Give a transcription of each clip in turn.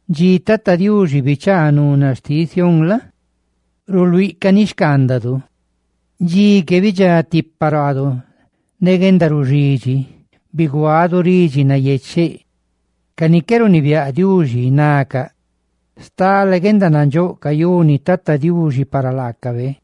Dxi Tata Diuxi bichaa nuna xtiꞌ Sión la? ruluíꞌ caníxcaandadu. Dxi que bidxá tipa ruaadu ne guendaruxidxi ne ridxi nayecheꞌ; ne ca ni qué runibiáꞌ Diuxi nacaꞌ: «¡Stale guendanandxóꞌ cayuni Tata Diuxi para laacabe!»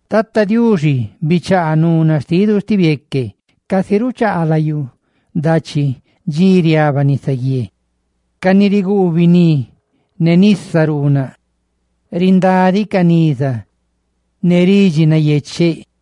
¡Tata Diuxi, bichaa nuna xtidu sti bieque, casi ruchaa layú dachi dxi riaba nisaguié! Ca ni riguu biní ne nisa riete lucaꞌ, rindádicaꞌ niza ne ridxi nayecheꞌ.